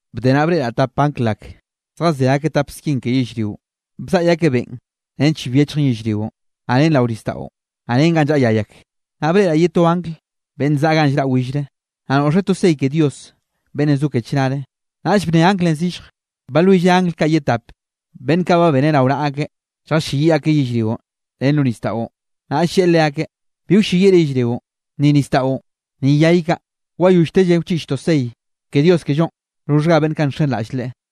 Bde naꞌ breꞌraꞌ tap angl ak, zjazé akeꞌ tap skin ke yellrionꞌ, bzaꞌy akeꞌ beꞌn nench bi wyechjen yellrionꞌ, naꞌ ren rao nisdaꞌo, naꞌ ren ganꞌ llaꞌa yay ak. Naꞌ breꞌraꞌ ye to angl beꞌnn zaꞌa ganꞌ llraꞌ willre, naꞌ noꞌxeꞌ to sey ke Dios beꞌnnenꞌ zo ke chnare. Naꞌll bnne anglenꞌ zillje, balwilleꞌ angl kaꞌ ye tap, beꞌnn kaꞌ ba beneꞌ rao naꞌa akeꞌ lljalleyiꞌ akeꞌ yellrio ren lo nisdaꞌo. Naꞌll lleꞌe leakeꞌ: —Bi wlleyiꞌre yellrionꞌ, ni nisdaꞌo, ni yay kaꞌ wayolltelle wchiꞌchtoꞌ sey ke Dios kellonꞌ roxhga beꞌnn kaꞌ nxenraꞌll Leꞌe.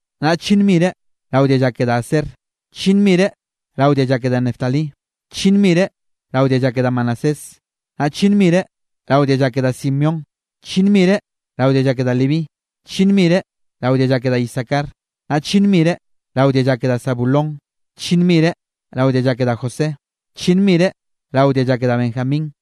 naꞌ chllinn mire rao dialla ke da Aser, chllinn mire rao dialla ke da Neftalí, chllinn mire rao dialla ke da Manasés, naꞌ chllinn mire rao dialla ke da Simeón, chllinn mire rao dialla ke da Leví, chllinn mire rao dialla ke da Isacar, naꞌ chllinn mire rao dialla ke da Zabulón, chllinn mire rao dialla ke da José, chllinn mire rao dialla ke da Benjamín.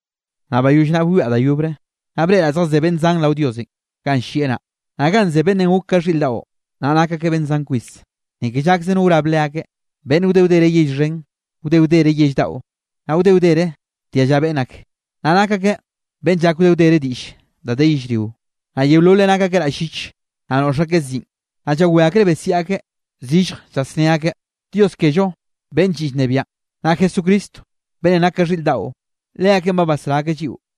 Naꞌ bayoll naꞌ bwiaꞌ da yobre, naꞌ breꞌraꞌ zjazé beꞌnn zan rao Diosenꞌ ganꞌ llieꞌ naꞌ, naꞌ ganꞌ ze beꞌnnenꞌ gok ka xhiꞌr daꞌo, naꞌ nak akeꞌ beꞌnn zan kwis. Ni ke llakze no wrab leakeꞌ, beꞌnn wde wdere yell xhen, wde wdere yell daꞌo, naꞌ wde wdere dialla beꞌnn ak, naꞌ nak akeꞌ beꞌnn llak wde wdere diꞌll da de yellrionꞌ. Naꞌ yeololeꞌ nak akeꞌ raꞌll llich, naꞌ noꞌx akeꞌ ziꞌn. Naꞌ llawé akreꞌ besiaꞌ akeꞌ zillje, llasné akeꞌ: Dios kello beꞌnn lliꞌ llnebiaꞌn, naꞌ Jesucristo beꞌnn nak ka xhiꞌr daꞌo, leakeꞌn ba basrá akeꞌ lliꞌo.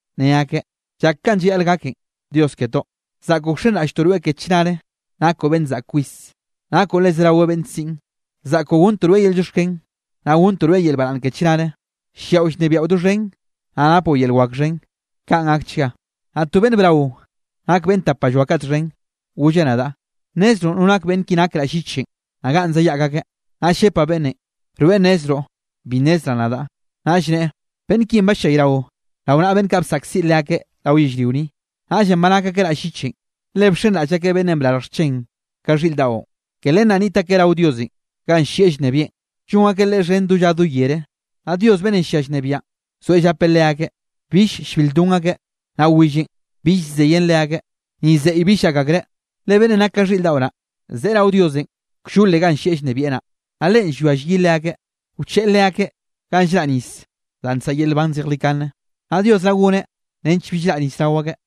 ne akeꞌ: Llak kanꞌ llayaꞌl gaken, Dios ketoꞌ. Zaꞌkoꞌ wxenraꞌlltoꞌ rweꞌ ke chnare, nakoꞌ beꞌnn zaꞌk kwis, nakoꞌ le zerawe beꞌnn siꞌn, zaꞌkoꞌ gonntoꞌ rweꞌ yel llioxken, naꞌ gonntoꞌ rweꞌ yel baraꞌnn ke chnare, lliaꞌo llnebiaꞌo doxhen, naꞌ napoꞌ yel wak xhen. Kaꞌn gakchga. Naꞌ to beꞌnn braonꞌ nak beꞌnn tapalloa kaꞌ txhen, golleꞌ nadaꞌ: —¿Nnezroꞌ no nake beꞌnn ki nak raꞌll llichenꞌ, naꞌ ganꞌ zayaꞌk akeꞌ? Naꞌll llepaꞌ beꞌnnenꞌ: —Rweꞌ nnezroꞌ, bi nnezraꞌ nadaꞌ. Naꞌll neꞌe: —Beꞌnn kinꞌ ballayrao rao naꞌa beꞌnn kaꞌ bsaꞌkziꞌ leakeꞌ rao yellrio ni, naꞌllenꞌ ba nak akeꞌ raꞌll llichenꞌ, le bxenraꞌll akeꞌ beꞌnnenꞌ brarj xchen ka xhiꞌr daꞌo. Ke len naꞌ niꞌt akeꞌ rao Diosenꞌ ganꞌ llieꞌ llnebieꞌn, llon akeꞌ Leꞌe xhen do lla do yere. Naꞌ Dios beꞌnnenꞌ llia llnebiaꞌn, zoeꞌ llapeꞌ leakeꞌ. Bill llbil lldon akeꞌ, naꞌ willenꞌ bill llzeyen leakeꞌ, ni zeꞌy bill llak akreꞌ. Le beꞌnnenꞌ nak ka xhiꞌr daꞌo naꞌ, zeꞌe rao Diosenꞌ kllole ganꞌ llieꞌ llnebieꞌ naꞌ, naꞌ Leꞌen llwia llyi leakeꞌ, wcheꞌe leakeꞌ ganꞌ llraꞌ nis danꞌ nsaꞌa yel nban zejlikane, naꞌ Dios naꞌ goneꞌ nench bill raꞌ nis rao ake.